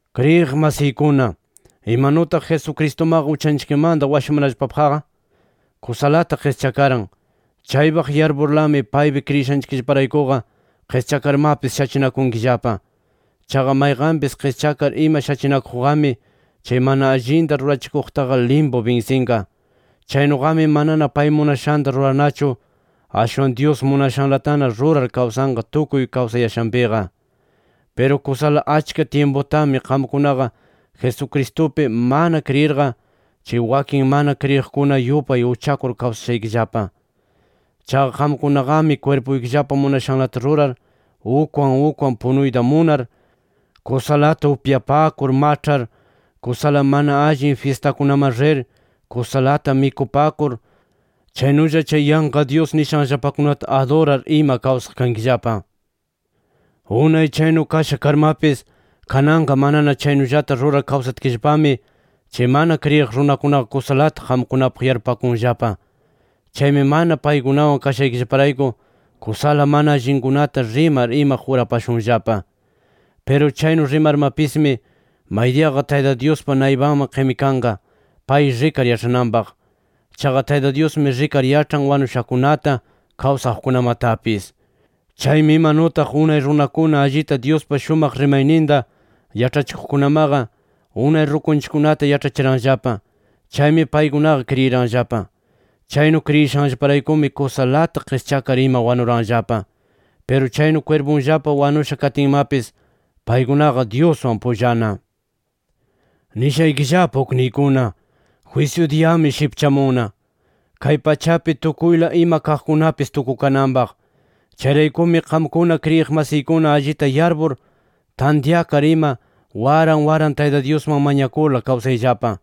Kriyiq masiykuna, imanutaq Jesucristumaqa uchanchikmanta washamanallapapaqqa kusalata qischakaran, chaypaq yarpurlami paypi kriyishaykillaparaykuqa qischakarmapis shachinakunkillapa. Chaqa mayqanpis qischakar ima shachinakuqqami, chay mana allinta rurachikuqtaqa limpu binsinqa. Chaynuqami manana pay munashanta rurarnachu, ashwan Dyus munashanlatana rurar kawsanqa tukuy kawsayashanpiqa. Piru kusala achka tyimputami qamkunaqa Jesucristupi mana kriyirqa, chay wakin mana kriyiqkuna yupay uchakur kawsashaykillapa. Chaqa qamkunaqami kwirpuykillapa munashanlata rurar, ukwan ukwan punuyta munar, kusalata upyapakur maĉhar, kusala mana allin fyistakunaman rir, kusalata mikupakur, chaynulla chay yanqa dyus nishanllapakunata adurar, ima kawsaq kankillapa. Unay chaynu kasha karmapis kananqa manana chaynullata rurar kawsatkillapami, chay mana kriyiq runakunaqa kusalata qamkunapaq yarpupakunllapa. Chaymi mana paykunawan kashaykillaparayku kusala mana allinkunata rimar ima jurapashunllapa. Piru chaynu rimarmapismi, maydiyaqa Tayta Dyuspa naypanman qimikanqa, pay rikar yaĉhananpaq. Chaqa Tayta Dyusmi rikar yaĉhan wanushakunata, kawsaqkunamatapis. Chaymi imanutaq unay runakuna allita Dyuspa shumaq rimayninta yaĉhachikuqkunamaqa, unay rukunchikkunata yaĉhachiranllapa. Chaymi paykunaqa kriyiranllapa. Chaynu kriyishanllaparaykumi, kusalata qischakar ima wanuranllapa. Piru chaynu kwirpunllapa wanusha katinmapis, paykunaqa Dyuswan pullana. Nishaykillapa ukniykuna: Jwisyu diyami shipchamunna, kay pachapi tukuyla ima kaqkunapis tukukananpaq. Chayraykumi qamkuna kriyiq masiykuna allita yarpur, tantyakar ima, waran waran Tayta Dyusman mañakurla kawsayllapa.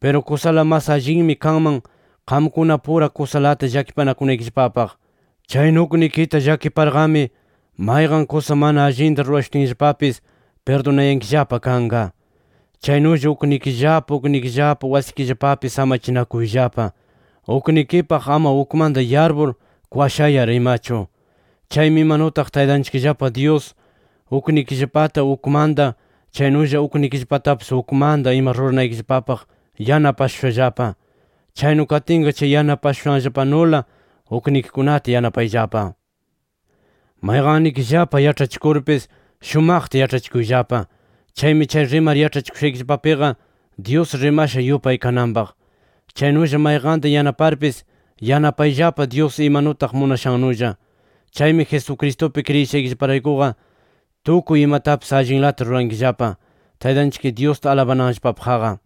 Piru kusala mas allinmi kanman qamkunapura kusalata llakipanakunaykillapapaq. Chaynu uknikita llakiparqami, mayqan kusa mana allinta rurashutinllapapis pirdunayankillapa kanqa. Chaynulla uknikillapa uknikillapa wasikillapapi samachinakuyllapa, uknikipaq ama ukmanta yarpur, kwashayar imachu. Chaymi imanutaq Taytanchikllapa Dyus uknikillapata ukmanta chaynulla uknikillapatapis ukmanta ima ruranaykillapapaq yanapashushallapa. Chaynu katinqa chay yanapashushanllapanula uknikikunata yanapayllapa. Mayqannikillapa yaĉhachikurpis shumaqta yaĉhachikuyllapa. Chaymi chay rimar yaĉhachikushaykillapapiqa Dyus rimasha yupay kananpaq. Chaynulla mayqanta yanaparpis, yanapayllapa Dyus imanutaq munashannulla. Chaymi Jesucristupi kriyishaykillaparaykuqa tukuy imatapis allinlata rurankillapa, Taytanchik Dyusta alabananllapapaqqa.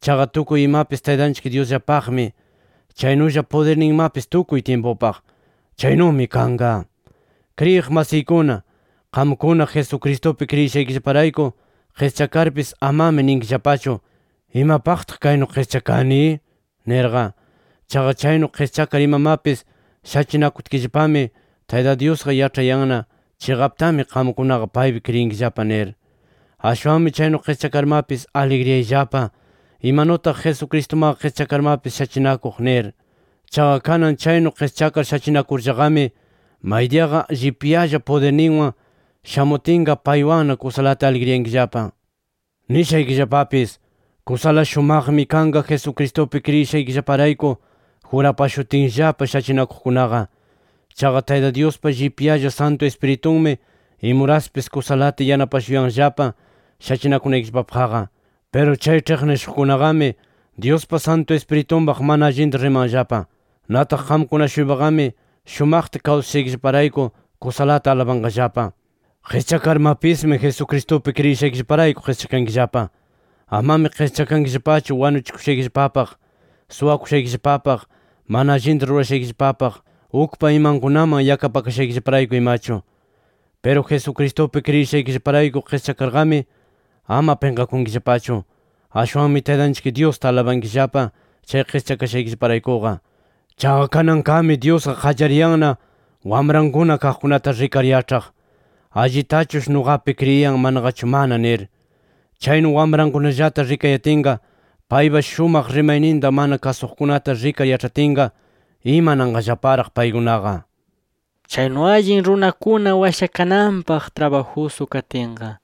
Chaqa tukuy imapis Taytanchik Dyusllapaqmi. Chaynulla pudirninmapis tukuy tyimpupaq. ¡Chaynumi kanqa! Kriyiq masiykuna, qamkuna Jesucristupi kriyishaykillaparayku qischakarpis amami ninkillapachu: “¿Imapaqtaq kaynu qischakani?” nirqa. Chaqa chaynu qischakar imamapis shachinakutkillapami Tayta Dyusqa yaĉhanayanna chiqaptami qamkunaqa paypi kriyinkillapa nir. Ashwanmi chaynu qischakarmapis aligriyayllapa, imanutaq Jesucristumaqa qischakarmapis shachinakuq nir. Chaqa kanan chaynu qischakar shachinakurllaqami, maydiyaqa llipyalla pudirninwan shamutinqa paywanna kusalata aligriyankillapa. Nishaykillapapis: Kusala shumaqmi kanqa Jesucristupi kriyishaykillaparayku jurapashutinllapa shachinakuqkunaqa. Chaqa Tayta Dyuspa llipyalla Santu Ispiritunmi imuraspis kusalata yanapashuyanllapa shachinakunaykillapapaqqa. [Piru chay ĉhiqnishuqkunaqami Dyuspa Santu Ispiritunpaq mana allinta rimanllapa. Nataq qamkuna-shuypaqami shumaqta kawsashaykillaparayku, kusalata alabanqallapa.] Qischakarmapismi Jesucristupi kriyishaykillaparayku qischakankillapa. Amami qischakankillapachu wanuchikushaykillapapaq, suwakushaykillapapaq, mana allinta rurashaykillapapaq, ukpa imankunaman yakapakashaykillaparayku imachu. Piru Jesucristupi kriyishaykillaparayku qischakarqami, ama pinqakunkillapachu. Ashwanmi Taytanchik Dyusta alabankillapa chay qischakashaykillaparaykuqa. Chaqa kananqami Dyusqa qallariyanna wamrankuna kaqkunata rikar yaĉhaq, allitachush nuqapi kriyin manaqachu mana nir. Chaynu wamrankunallata rikayatinqa, paypa shumaq rimayninta mana kasuqkunata rikar yaĉhatinqa, imananqallaparaq paykunaqa. Chaynu allin runakuna washakananpaq trabajusu katinqa,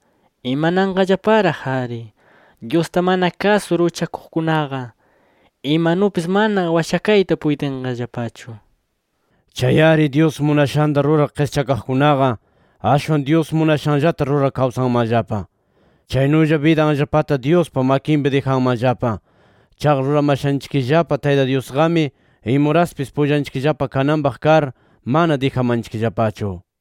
¿imananqallaparaq-ari Dyusta mana kasur uchakuqkunaqa? Imanupis mana washakayta puytinqallapachu. Chay-ari, Dyus munashanta rurar qischakaqkunaqa, ashwan Dyus munashanllata rurar kawsanmanllapa. Chaynulla bidanllapata Dyuspa makinpi dijanmanllapa. Chaqa ruramashanchikllapa Tayta Dyusqami imuraspis pullanchikllapa kananpaq kar, mana dijamanchikllapachu.